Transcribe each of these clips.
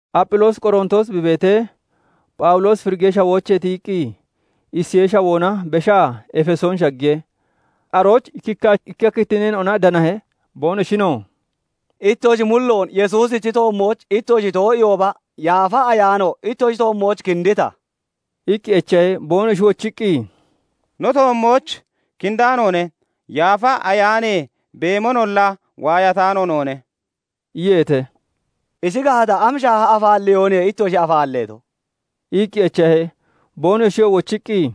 Apphiloosi Qorontoos bi beetee, Phawuloosi Firigee Shawoochee tiyiqqi, Isiyee Shawoona beshaa Efesoon shaggiye. Arooch ikkikka kittinneena'ona danahe. Boonoshinoo "Ittoshi mulloon Yesuusichi toommooch ittoshi too'iihooba, Yaafa Ayaano ittoshi toommooch kindita?" iqqi echahe. Boonoshi wochiqqi, "No toommooch kindaanoone; Yaafa Ayaanee beemonolla waayataano noone" iyeete. "Ishi gaata, am shaaha afaalleyooniye ittoshi afaalleeto?" iqqi echahe. Boonoshiyoo wochiqqi,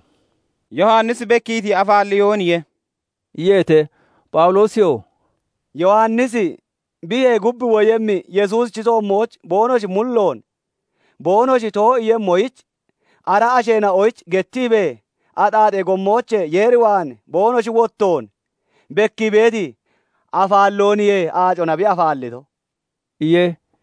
"Yowannisi bekkiiti afaalleyooniye" iyeete. Phawuloosiyoo "Yowannisi biyee gub woyemmi Yesuusichi toommooch boonoshi mulloon boonoshi too'iiyemmoyich ara asheena'oyich gettiibee, axaaxee gommoochee Yeer waan boonoshi wottoon bekkii beeti afaallooniye aacona bi afaallito" iye.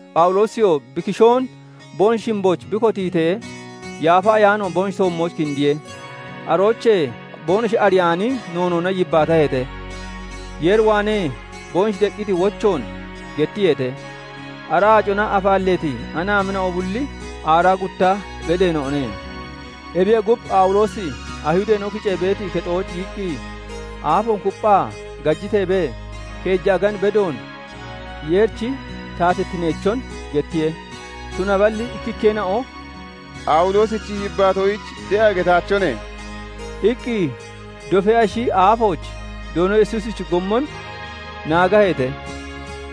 Phawuloosiyoo bi kishoon boonoshi shimbooch bi kotiitee, Yaafa Ayaano boonoshi toommooch kindiye. Aroochee boonoshi ariyaani noonoona yibbaataheete; Yeer waanee boonoshi deqqiti wochoon gettiyeete. Ara aacona afaalleeti anaamina'o bulli aaraa gutta beddeena'one. Ebiyee gub, Phawuloosi Ayihudeena'o kicee beeti kexooch giyiqqi, aafoon kupphaa gajiteebee, keeja agan bedoon Yeerichi taatittineechon gettiye. Tunaballi ikkikkeena'o "Phawuloosichi yibbaatoyich de'a getaachone" iqqi dofee ashi aafooch Doono Yesuusichi gommon naagaheete.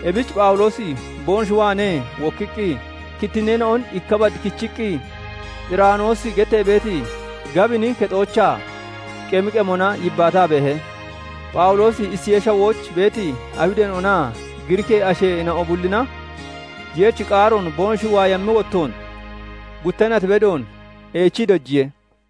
Ebich Phawuloosi boonoshi waanee wokkiqqi, kittinneena'on ikka bad kichiqqi, Xiraanoosi gettee beeti gabini kexoochaa, qemi qemona yibbaataa beehe. Phawuloosi Isiyee Shawooch beeti Ayihudeena'onaa Giriikee asheena'o bullina Yeerichi qaaroon boonoshi waayammi wottoon, gutta nat bedoon eechii dojiye.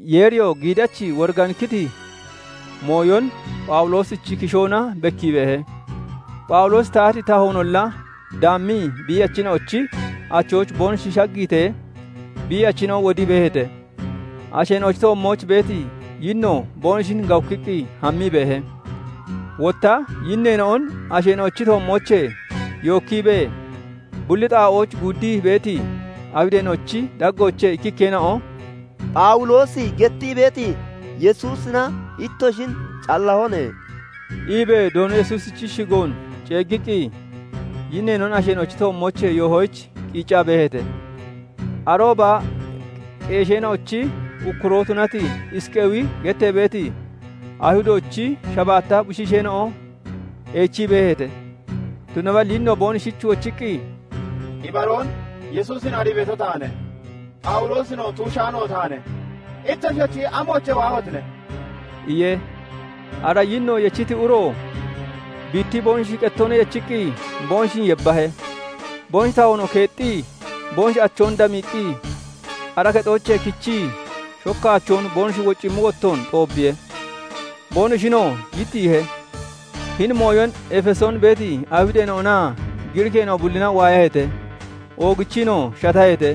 Yeeriyoo giidachi woriganikkiti mooyon Phawuloosichi kishoona bekkii beehe. Phawuloosi tahati tahoonolla daammii biiyachina'ochi achooch boonoshi shaggiitee, biiyachina'o wodii beeheete; asheena'ochi toommooch beeti yinnoo boonoshin gawukkiqqi hammii beehe. Wotta yinneena'on asheena'ochi toommoochee yookkiibee, bulli xaa'ooch guuddii beeti Ayihudeena'ochi daggoochee ikkikkeena'o "Phawuloosi gettii beeti Yesuusina ittoshin callahone" iibee Doono Yesuusichi shigoon ceeggiqqi, yinneena'on asheena'ochi toommoochee yoohoyich qiiccaa beeheete. Arooba qeesheena'ochi ukkuroo tunati Isqeewi gettee beeti Ayihudoochi shabaatta bushiisheena'o eechii beeheete. Tunaballi yinno boonoshich wochiqqi, "[Ibaroon] Yesuusin arii beeto taane; Phawuloosinoo tuushaano taane; ittoshiyochi amoochee waahotine?" iye. Ara yinno yechiti uro biittii boonoshi qettoona yechiqqi boonoshin yebbahe; boonoshi tahoonoo keexxii, boonoshi achoon damiiqqi, ara kexoochee kechii shokkaachoon boonoshi wocammi wottoon xoobbiye; boonoshinoo yittiihe. Hini mooyon Efesoon beeti Ayihudeena'onaa Giriikeena'o bullina waayaheete; oogichiinoo shataheete;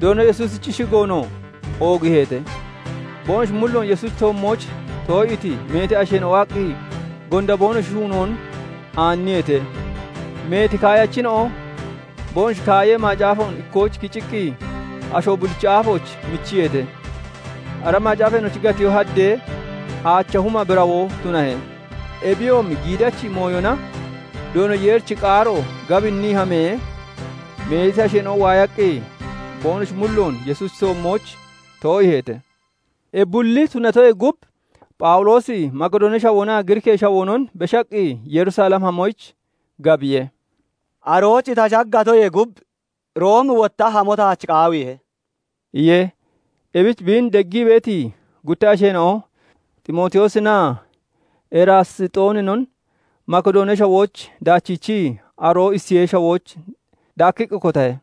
Doono Yesuusichi shigoonoo oogiiheete. Boonoshi mulloon Yesuusichi toommooch too'iiti meeti asheena'o waaqqi, gonda boonoshi shuunoon aanniyeete. Meeti kaayachina'o boonoshi kaayee macaafoon ikkooch kiciqqi, asho bullichi aafooch michiyeete. Ara macaafeena'ochi gatiyoo haddee, aacha huma birawoo tunahe. Ebiyoomi giidachi mooyona Doono Yeerichi qaaro gabinnii hamee, meeti asheena'o waayaqqi, boonoshi mulloon Yesuusichi toommooch too'iiheete. Ebi bulli tunatoyee gub, Phawuloosi Makidoonee Shawoonaa Giriikee Shawoonon beshaqqi Yerusalem hamoyich gabiye; "Arooch ta shaggatoyee gub, Room wotta hamo taach qaawiihe" iye. Ebich biin deggii beeti gutta asheena'o Ximootiyoosinaa Eraasxooninon Makidoonee Shawooch daachiichii, aroo Isiyee Shawooch daakkiqqi kotahe.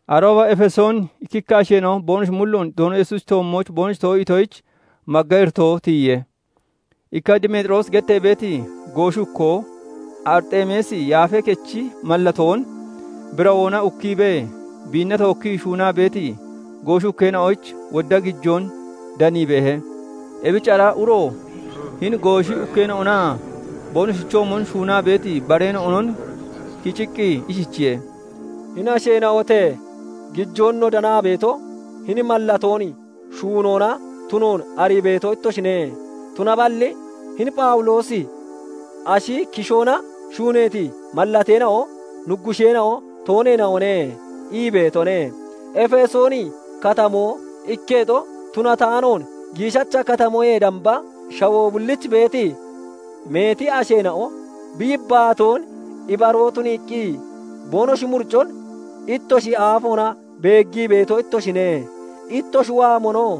Arooba Efesoon ikkikka asheena'o boonoshi mulloon Doono Yesuusichi toommooch boonoshi too'iitoyich magga iritoo tiyiye. Ikka Demeexiroosi gettee beeti gooshi ukkoo Arixeemisi yaafee kechi mallatoon birawoona ukkiibee biinna tookkii shuunaa beeti gooshi ukkeena'oyich wodda gijoon danii beehe. Ebich ara uro hini gooshi ukeena'onaa boonoshichoomon shuunaa beeti bareena'onon kiciqqi ishichiye:- "Hini asheena'ote! Gijoon no danaa beeto hini mallatoon shuunoona tunoon arii beeto ittoshine. Tunaballi hini Phawuloosi 'Ashi kishoona shuuneeti mallateena'o nuggusheena'o tooneena'one' ii beetone; Efesooni Katamoo ikketo tunataanoon giishacha katamoyee damba, shawoo bulliich beeti meeti asheena'o bi yibbaatoon ibaroo tuniiqqi boonoshi muricon ittoshi aafoona beeggii beeto ittoshine; ittoshi waamonoo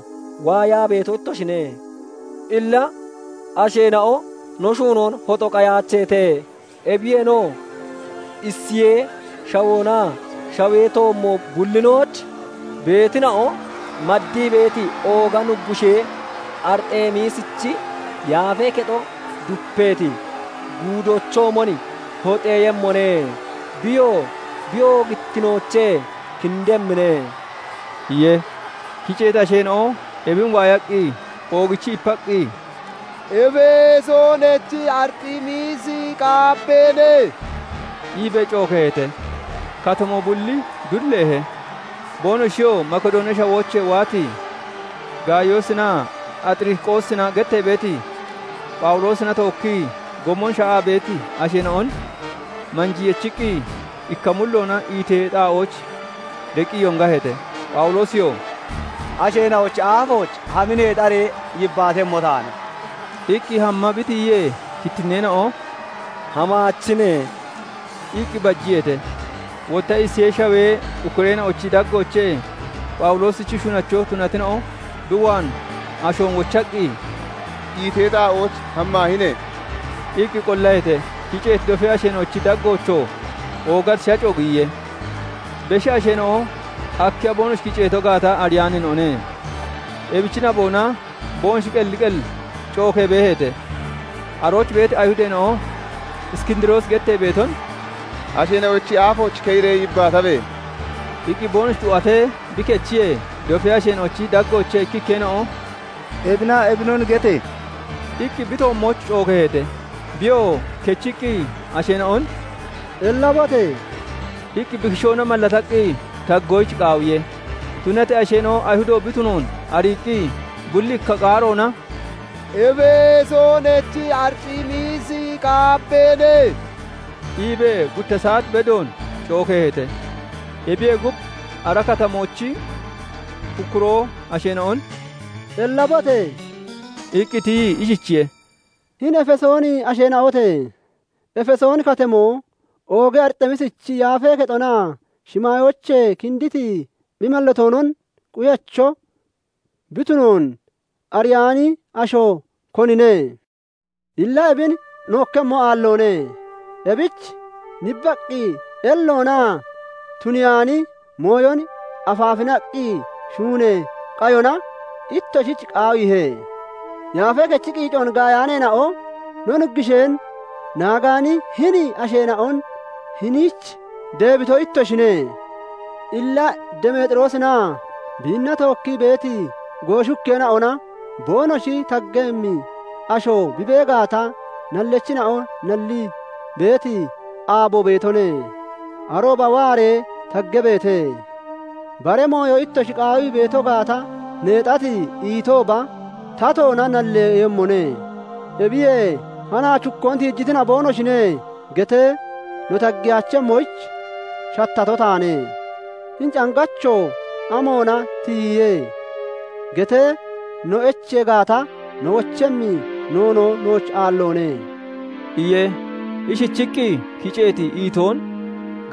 waayaa beeto ittoshine. Illa asheena'o no shuunoon hoxo qayaacheete; ebiyeenoo Isiyee Shawoonaa shawee toommo bullinooch beetina'o maddii beeti ooga nuggushee Arixeemisichi yaafee kexo dupeeti guudoochoomon hoxeeyemmone; Biyoo bi oogittinoochee kindemmine" iye. Kiceeti asheena'o ebin waayaqqi oogichii ipaqqi, "Efesoonachi Arixeemisi qaabbeene!" iibee cookeeheete. Katamoo bulli dulleehe; boonoshiyoo Makidoonee Shawoochee waati Gaayoosinaa Axiriqoosina gettee beeti, Phawuloosina tookkii gommon sha'aa beeti asheena'on manjii yechiqqi, ikka mulloona iitee xaa'ooch deqqi yongaheete. Phawuloosiyoo "Asheena'ochi aafooch hami neexaree yibbaatemmo taane" iqqi hamma bi tiyiyee, kittinneena'o "Hamaachine" iqqi bajiyeete. Wotta Isiyee Shawee ukkureena'ochi daggoochee Phawuloosichi shunacho tunatina'o bi waan ashoon wochaqqi, "Iitee xaa'ooch hammaahine!" iqqi qollaheete. Kiceeti dofee asheena'ochi daggoochoo oogati shaco giyiye; beshi asheena'o akkiya boonoshi kiceeto gaata ariyaaneena'one; ebichi naboona boonoshi qelli qel cookee beeheete. Arooch beeti Ayihudeena'o Iskindiroosi gettee beeton "Asheena'ochi aafooch keyiree yibbaatabe!" iqqi boonoshi xu'atee bi kechiyee, dofee asheena'ochi daggoochee ikkikkeena'o "Ebinaa ebinon gete!" iqqi bi toommooch cookeeheete. Biyoo kechiqqi asheena'on "Ellabote!" iqqi bi kishoona mallataqqi taggoyich qaawiye. Tunatee asheena'o Ayihudo bi tunoon ariiqqi, bulli ikka qaaroona "Efesoonachi Arixeemisi qaabbeene!" iibee gutta saat bedoon cookeeheete. Ebiyee gub, ara katamoochi ukkuroo asheena'on "Ellabote!" iqqi tiyii ishichiye:- "Hini Efesooni asheena'ote! Efesooni Katamoo ooga Arixeemisichi yaafee kexonaa shimaayoochee kinditi bi mallatoonon quyacho bi tunoon ariyaani asho, konine? Illa ebin nookkemmo aalloone; ebich nibbaqqi elloonaa tuniyaani mooyon afaafinaqqi shuunee qayona ittoshich qaawiihe. Yaafee kechi qiicoon gaayaaneena'o, no nuggusheen naagaani hini asheena'on hiniich deebito ittoshine. Illa Demeexiroosinaa biinna tookkii beeti gooshi ukkeena'ona boonoshi taggemmi asho bi bee gaata, nallachina'o nallii beeti aabo beetone; arooba waaree taggabeete. Bara mooyo ittoshi qaawii beeto gaata, neexati iitooba tatoona nalleeyemmone. Ebiyee 'Hanaach hukkoon tiijitina'o boonoshine' getee no taggeyaachemmoyich shattato taane. 'Hini cangacho amoona tiyiye?' getee no echee gaata, no wochemmi noonoo nooch aalloone" iye. Ishichiqqi kiceeti iitoon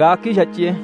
gaakkii shacciye.